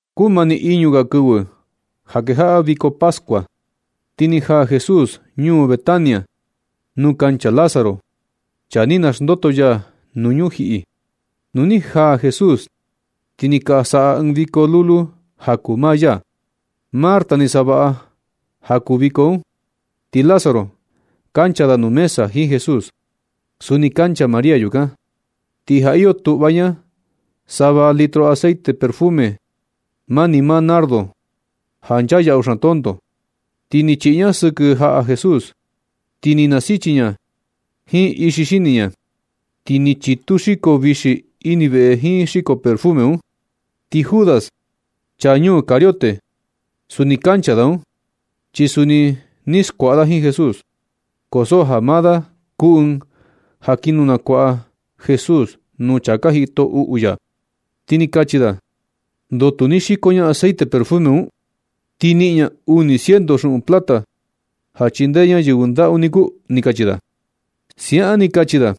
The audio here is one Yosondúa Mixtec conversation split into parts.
Kumani iñu ga kɨvɨ ja kejaꞌa viko pascua, ti ni jaa Jesús ñuu Betánia, nuu kancha Lázaro, chaa ni naxndoto ya nuu ñujiꞌi. Nu ni jaa Jesús ti ni ka saꞌa ɨɨn viko lulu ja kuu maa ya. Marta ni savaꞌa ja kuu viko un. Ti Lázaro kancha da nuu mesa jiin Jesús. Suni kancha María yukan. Ti ja iyo tuꞌva ña sava litro aceite perfume, mani maa nardo, ja nchaa yaꞌu xaan tonto, ti ni chiꞌi ña sɨkɨ jaꞌa Jesús. Ti na nasichi ña jiin ixi xini ña. Ti ni chitu xiko vixi ini veꞌe jiin xiko perfume un. Ti Judas, chaa ñuu Cariote, suni kancha da un, chi suni ni skuaꞌa da jiin Jesús. Ko so ja maa da kuu ɨɨn ja kin nukuaꞌa Jesús nuu chaa ka jito uꞌu ya. Ti ni kachi da: ―¿Ndoo tu ni xiko ña aceite perfume un? Ti i niꞌin ña uni ciento xuꞌun plata ja chindee ña yɨvɨ ndaꞌu niku ―ni kachi da. Siaꞌan ni kachi da,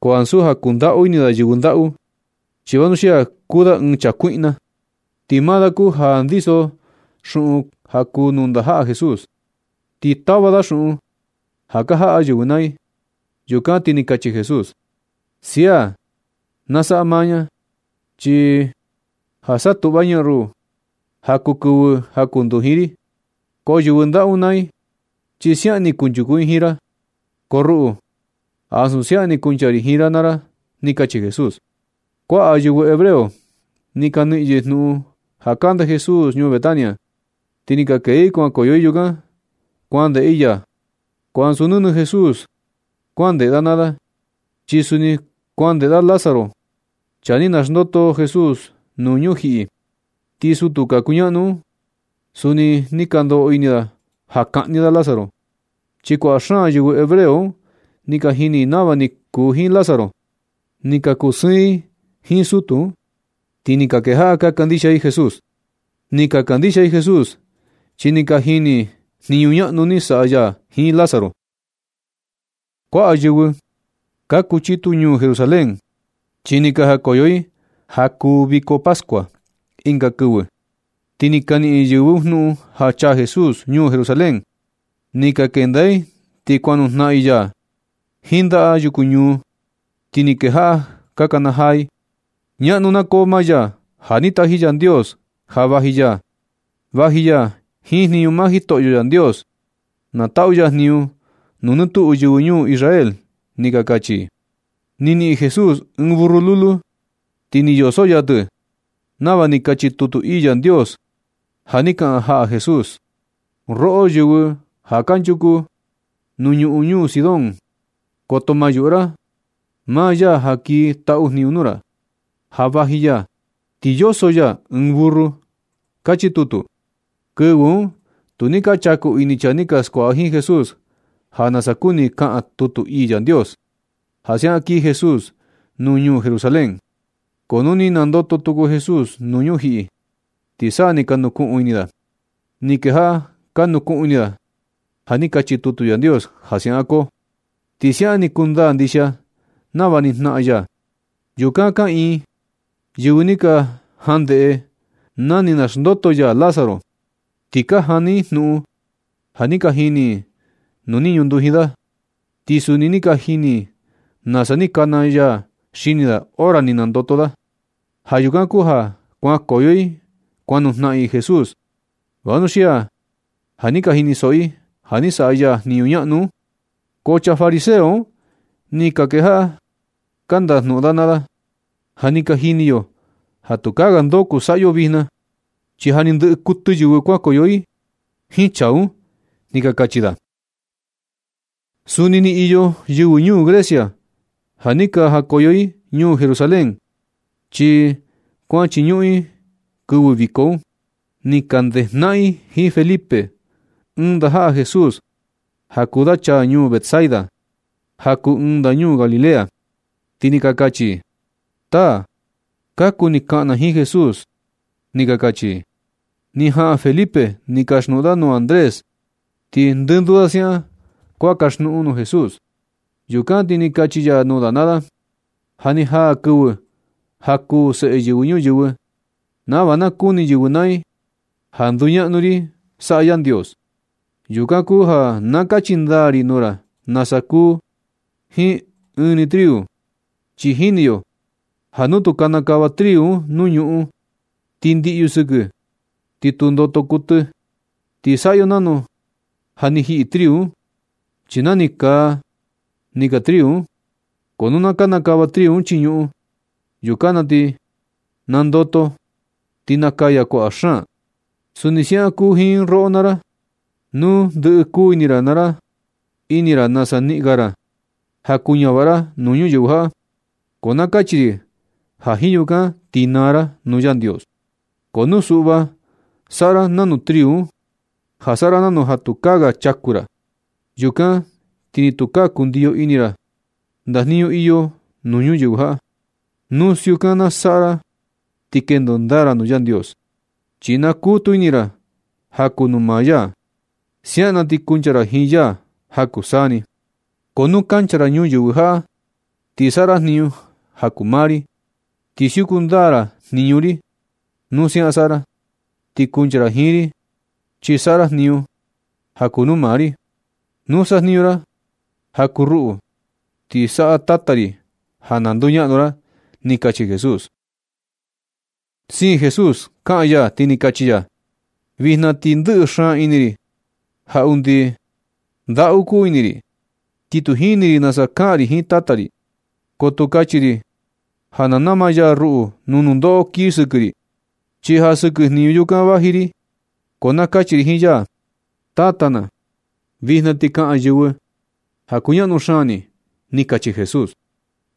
ko ansu ja kundaꞌu ini da yɨvɨ ndaꞌu, chi vanuxia kuu da ɨɨn chaa kuiꞌna. Ti maa da kuu ja ndiso xuꞌun ja kuu nuu ndajaꞌa Jesús, ti tava da xuꞌun ja ka jaꞌa yɨvɨ naa i. Yukan ti ni kachi Jesús: ―Sia na saꞌa maa ña, chi ja satuꞌva ña ruꞌu ja kuu kɨvɨ jakunduji ri. Ko yɨvɨ ndaꞌu un naa i, chi siaꞌan ni kunchuku i jiin ra, ko ruꞌu chi ansu siaꞌan ni kuncha ri jiin ra naa ra ―ni kachi Jesús. Kuaꞌa yɨvɨ hebreo ni ka niꞌin yɨ jnuꞌun ja kande Jesús ñuu Betania, ti ni ka kee i kuankoyo i yukan, kuandeꞌe i ya. Ko ansu nɨnɨ Jesús kuan ndeꞌe da naa da, chi suni kuan ndeꞌe da Lázaro, chaa ni naxndoto Jesús nuu ñujiꞌi. Ti sutu ka kuñaꞌnu un, suni ni ka ndoꞌo ini da ja kaꞌni da Lázaro. Chi kuaꞌa xaan yɨvɨ hebreo un ni ka jini i nava ni kuu jiin Lázaro, ni ka kusɨɨn i jiin sutu un, ti ni kejaꞌa ka kandixia i Jesús. Ni ka kandixia i Jesús chi ni ka jini i jniñu ñaꞌnu ni saꞌa ya jiin Lázaro. Kuaꞌa yɨvɨ ka kuchitu ñuu Jerusalén, chi ni ka jakoyo i ja kuu viko pascua. Ɨnga kɨvɨ, ti ni ka niꞌin yɨ jnuꞌun ja chaa Jesús ñuu Jerusalén. Ni ka kenda i ti kuan nujnaꞌan i ya jiin ndaꞌa yuku ñuu. Ti ni kejaꞌa ka kanajaa i: ―Ñaꞌnu na koo maa ya ja ni taji Yandios ja vaji ya. Vaji ya jiin jniñu maa Jitoꞌyo Yandios. Na taꞌu ya jniñu nuu nɨ tuꞌu yɨvɨ ñuu Israel ―ni ka kachi i. Ni niꞌin Jesús ɨɨn burru lulu, ti ni yoso ya tɨ nava ni kachi tutu ii Yandios ja ni kaꞌan jaꞌa Jesús: Roꞌo, yɨvɨ ja kanchuku nuu ñuꞌun ñuu Sión, koto ma yuꞌu ra. Maa ya ja kii taꞌu jniñu nuu ra, ja vaji ya, ti yoso ya ɨɨn burru. Kachi tutu. Kɨvɨ un tu ni ka chaku ini chaa ni ka skuaꞌa jiin Jesús ja nasa kuni kaꞌan tutu ii Yandios, ja siaꞌan kii Jesús nuu ñuu Jerusalén. Ko nu ni nandoto tuku Jesús nuu ñujiꞌi, ti sa ni ka nukuꞌun ini da. Ni kejaꞌa ka nukuꞌun ini da ja ni kachi tutu Yandios ja siaꞌan koo, ti siaꞌan ni kundaa ndixia nava ni jnaꞌan ya. Yukan kaꞌiin yɨvɨ ni ka jan ndeꞌe na ni naxndoto ya Lázaro, ti ka jani i jnuꞌun ja ni ka jini i nu ni ñunduji da, ti suni ni ka jini i nasa ni kana ya xini da hora ni nandoto da. Ja yukan kuu ja kuankoyo i kuan nujnaꞌan i Jesús, vanuxia ja ni ka jinisoꞌo i ja ni saꞌa ya jniñu ñaꞌnu un. Ko chaa fariseo un, ni ka kejaꞌa ka ndajnuꞌun da naa da: ―Ja ni ka jini yo ja tukaa ga ndo kuu saꞌa yo vijna na. Chi ja ni ndɨ kuɨtɨ yɨvɨ kuankoyo i jiin chaa un ―ni ka kachi da. Suni ni iyo yɨvɨ ñuu Grecia ja ni ka jakoyo i ñuu Jerusalén, chi kuan chiñuꞌun i kɨvɨ viko un. Ni ka ndejnaꞌan i jiin Felipe, ɨɨn ndajaꞌa Jesús ja kuu da chaa ñuu Betsaida, ja kuu ɨɨn ndañuu Galilea. Ti ni ka kachi i: ―Taa, ka kuni kaꞌan na jiin Jesús ―ni ka kachi i. Ni jaꞌan Felipe, ni kaxnuꞌun da nuu Andrés. Ti ndɨnduu da siaꞌan kuan kaxnuꞌun nuu Jesús. Yukan ti ni kachi ya nuu da naa da: ―Ja ni jaa kɨvɨ ja kuu Seꞌe Yɨvɨ Ñuyɨvɨ, nava na kuni yɨvɨ naa i ja nduñaꞌnu ri saꞌa Yandios. Yukan kuu ja na kachi ndaa ri nuu ra nasa kuu jiin ɨɨn ni triu. Chi jini yo ja nu tu kanakava triu un nuu ñuꞌun ti ndiꞌyu sɨkɨ, ni tu ndoto kuɨtɨ. Ti saꞌa yo nanu ja ni jiꞌi triu un. Chi nani kaa ni kaa triu un. Ko nu na kanakava triu un chii ñuꞌun, yukan na ti nandoto ti nakaya kuaꞌa xaan. Suni siaꞌan kuu jiin roꞌo naa ra. Nu ndɨꞌɨ kuu ini ra nasa niꞌin ga ra ja kuñavaꞌa ra nuu ñuyɨvɨ jaꞌa, ko na kachi ri ja jiin yukan ti naa ra nuu Yandios. Ko nu suꞌva na saꞌa ra nanu triu un, ja saꞌa ra nanu ja tukaa ga chaku ra, yukan ti ni tukaa kundiyo ini ra ndajniñu iyo nuu ñuyɨvɨ jaꞌa. Nu siukan na saꞌa ra ti kendo ndaa ra nuu Yandios, chi nakutu ini ra ja kuu nuu maa ya. Siaꞌan na ti kuncha ra jiin ya ja kuu saa ni. Ko nu kancha ra ñuyɨvɨ jaꞌa ti saꞌa ra jniñu ja kuu maa ri, ti siuku ndaa ra jniñu ri. Nu siaꞌan saꞌa ra, ti kuncha ra jiin ri, chi saꞌa ra jniñu ja kuu nuu maa ri. Nu sajniñu ra ja kuu ruꞌu, ti na saꞌa Tata ri ja na nduñaꞌnu ra ―ni kachi Jesús. Siin Jesús kaꞌan ya ti ni kachi ya: ―Vijna ti ndɨꞌɨ xaan ini ri ja undi ndaꞌu kuu ini ri. Ti tu jini ri nasa kaꞌan ri jiin Tata ri. Ko tu kachi ri ja na nama ya ruꞌu nuu nundoꞌo kii sɨkɨ ri, chi ja sɨkɨ jniñu yukan vaji ri. Ko na kachi ri jiin ya: “Tata na, vijna ti na kaꞌan yɨvɨ ja kuñaꞌnu xaan ni” ―ni kachi Jesús.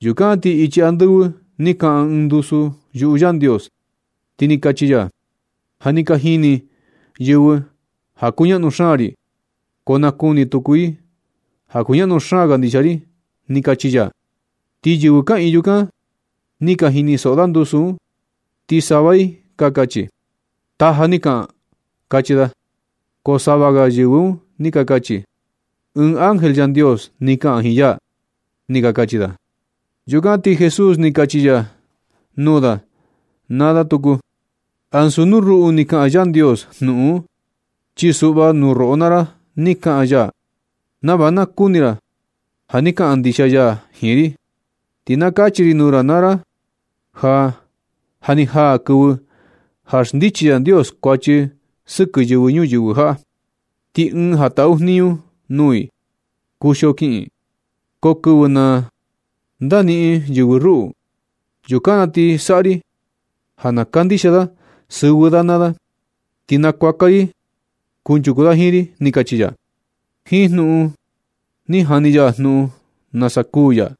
Yukan ti ichi andɨvɨ ni kaꞌan ɨɨn ndusu yuꞌu Yandios, ti ni kachi ya: ―Ja ni ka jini yɨvɨ ja kuñaꞌnu xaan ri, ko na kuni tuku i ja kuñaꞌnu xaan ndixia ri ―ni kachi ya. Ti yɨvɨ kaꞌiin yukan ni ka jinisoꞌo da ndusu un, ti sava i ni ka kachi: ―Taja ni kaꞌan ―kachi da. Ko sava ga yɨvɨ un ni ka kachi: ―Ɨɨn ángel Yandios ni kaꞌan jiin ya ―ni ka kachi da. Yukan ti Jesús ni kachi ya nuu da naa da tuku: ―Ansu nuu ruꞌu ni kaꞌan Yandios jnuꞌun un, chi suꞌva, nuu roꞌo naa ra ni kaꞌan ya nava na kuni ra ja ni kaꞌan ndixia ya jiin ri. Ti na kachi ri nuu ra naa ra ja ja ni jaa kɨvɨ ja xndichi Yandios kuachi sɨkɨ yɨvɨ ñuyɨvɨ jaꞌa. Ti ɨɨn ja taꞌu jniñu nuu i kuxio kiꞌin ɨɨn. Ko kɨvɨ na ndaniꞌin yɨvɨ ruꞌu, yukan na ti saꞌa ri ja na kandixia da sɨvɨ da naa da, ti nakuaka ri yɨ kunchuku da jiin ri ―ni kachi ya. Jiin jnuꞌun un ni jani ya jnuꞌun nasa kuu ya.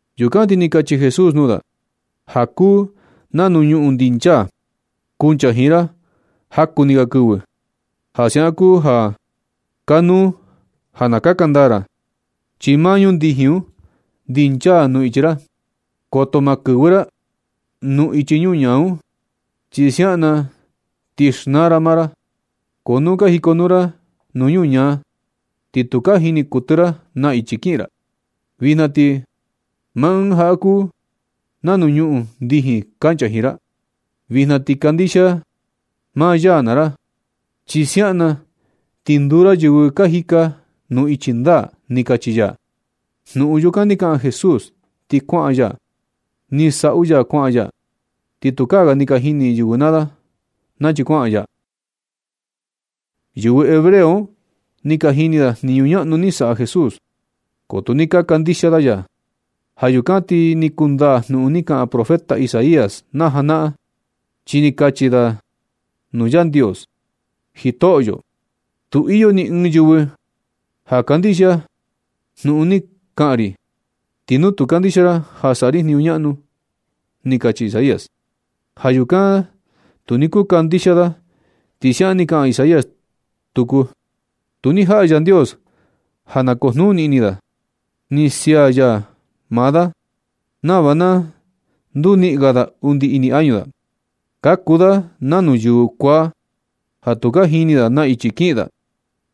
Yukan ni kachi Jesús nuu da: ―Maa ɨɨn ja kuu nanu ñuꞌun ndinchaa, kuncha jiin ra jaku ni ga kɨvɨ. Ja siaꞌan kuu ja kanuu ja na kaka ndaa ra, chi maa ñuꞌun ndijin un ndinchaa nuu ichi ra. Koto maa kɨvɨ ra nuu ichi ñuñaa un, chi siaꞌan na ti xnaa ra maa ra. Ko nu ka jikonuu ra nuu ñuñaa, ti tu ka jini kuɨtɨ ra na ichi kiꞌin ra. Vijna ti maa Ɨɨn ja kuu nanu ñuꞌun ndijin kancha jiin ra. Vijna ti kandixia maa ya naa ra, chi siaꞌan na ti nduu ra yɨvɨ ka jika nuu ichi ndaa ―ni kachi ya. Jnuꞌun yukan ni kaꞌan Jesús ti kuaꞌan ya. Ni saꞌu ya kuaꞌan ya. Ti tukaa ga ni ka jini yɨvɨ naa da nachi kuaꞌan ya. Yɨvɨ hebreo un ni ka jini da jniñu ñaꞌnu ni saꞌa Jesús, ko tu ni ka kandixia da ya. Ja yukan ti ni kundaa jnuꞌun ni kaꞌan profeta Isaías na janaꞌan, chi ni kachi da nuu Yandios: Jitoꞌyo, tu iyo ni ɨɨn yɨvɨ ja kandixia ra jnuꞌun ni kaꞌan ri. Ni tu ni kandixia ra ja saꞌa ri jniñu ñaꞌnu. Ni kachi Isaías. Ja yukan tu ni kuu kandixia da, ti siaꞌan ni kaꞌan Isaías tuku: Tu ni jaꞌa Yandios ja na kujnuni ini da. Ni sia ya maa da nava na nduniꞌin ga undi ini añu da. Ka kuu da nanu yɨvɨ kuaa ja tu ka jini da na ichi kiꞌin da,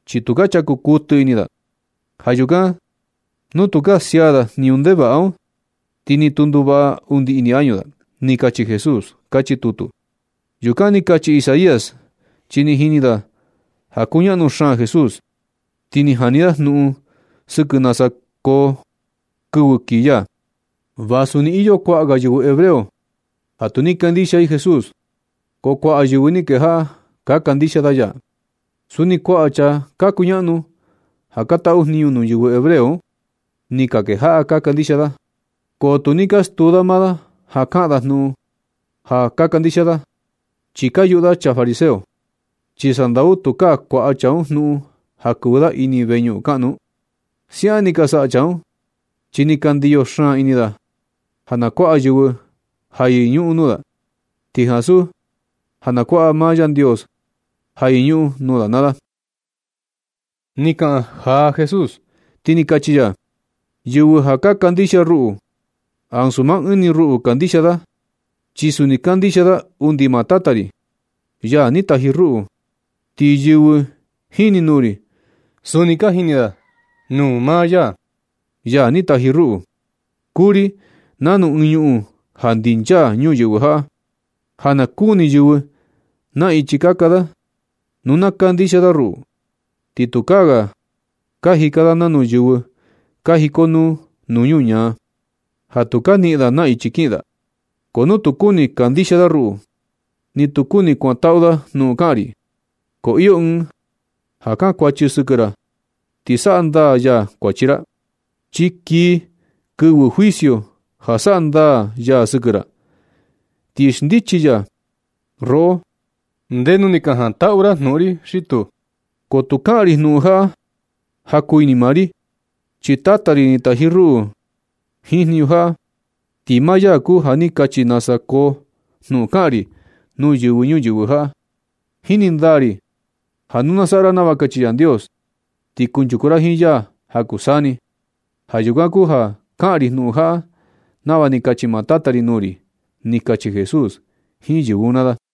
chi tu chaku kuɨtɨ ini da. Ja yukan nu tukaa sia da jniñu ndevaꞌa un, ti ni tu nduvaꞌa undi ini añu da. Ni kachi Jesús, kachi tutu. Yukan ni kachi Isaías chi ni jini da ja kuñaꞌnu xaan Jesús, ti ni jani da jnuꞌun sɨkɨ nasa koo kɨvɨ kii ya. Vasu ni iyo kuaꞌa ga yɨvɨ hebreo ja tu ni kandixia i Jesús, ko kuaꞌa yɨvɨ ni kejaꞌa ka kandixia da ya. Suni kuaꞌa chaa ka kuñaꞌnu ja ka taꞌu jniñu nuu yɨvɨ hebreo un, ni ka kejaꞌa ka kandixia da. Ko tu ni ka stuu da maa da ja kaꞌan da jnuꞌun ja ka kandixia da, chi ka yuꞌu da chaa fariseo. Chi sandau tukaa kuaꞌa chaa un jnuꞌun ja kɨvɨ da ini veñuꞌun kaꞌnu un. Siaꞌan ni ka saꞌa chaa un, chi ni ka ndiyo xaan ini da ja na kuaꞌa yɨvɨ ja yɨñuꞌun nuu da, ti ansu ja na kuaꞌa maa Yandios ja yɨñuꞌun nuu da naa da. Ni kaꞌan jaa Jesús, ti ni kachi ya: ―Yɨvɨ ja ka kandixia ruꞌu, ansu maa ɨɨn ni ruꞌu kandixia da, chi suni kandixia da undi maa Tata ri, ya ni taji ruꞌu. Ti yɨvɨ jini nuu ri, suni ka jini da nuu maa ya ni taji ruꞌu. Kuu ri nanu ɨɨn ñuꞌun ja ndinchaa ñuyɨvɨ jaꞌa, ja na kuni yɨvɨ na ichi kaka da. Nu na kandixia da ruꞌu, ti tukaa ga ka jika da nanu yɨvɨ ka jikonuu nuu ñuñaa, ja tu ka niꞌin da na ichi kiꞌin da. Ko nu tu kuni kandixia ra ruꞌu, ni tu kuni kuantaꞌu ra jnuꞌun kaꞌan ri. Ko iyo Ɨɨn ja kankuachi sɨkɨ ra ti saꞌa ndaa ya kuachi ra. Chi kii kɨvɨ juicio ja saꞌa ndaa ya sɨkɨ ra, ti xndichi ya roꞌo ndenu ni ka jantaꞌu ra jnuꞌun ri xi tuu. Ko tu kaꞌan ri jnuꞌun jaꞌa ja kuu ini maa ni ri, chi Tata ri ni taji ruꞌu jiin jniñu jaꞌa. Ti maa ya kuu ja ni kachi nasa koo jnuꞌun kaꞌan ri nuu yɨvɨ ñuyɨvɨ jaꞌa. Jini ndaa ri ja nu na saꞌa ra nava kachi Yandios, ti kunchuku ra jiin ya ja kuu saa ni. Ja yukan kuu ja kaꞌan ri jnuꞌun jaꞌa nava ni kachi maa Tata ri nuu ri ―ni kachi Jesús jiin yɨvɨ un naa da.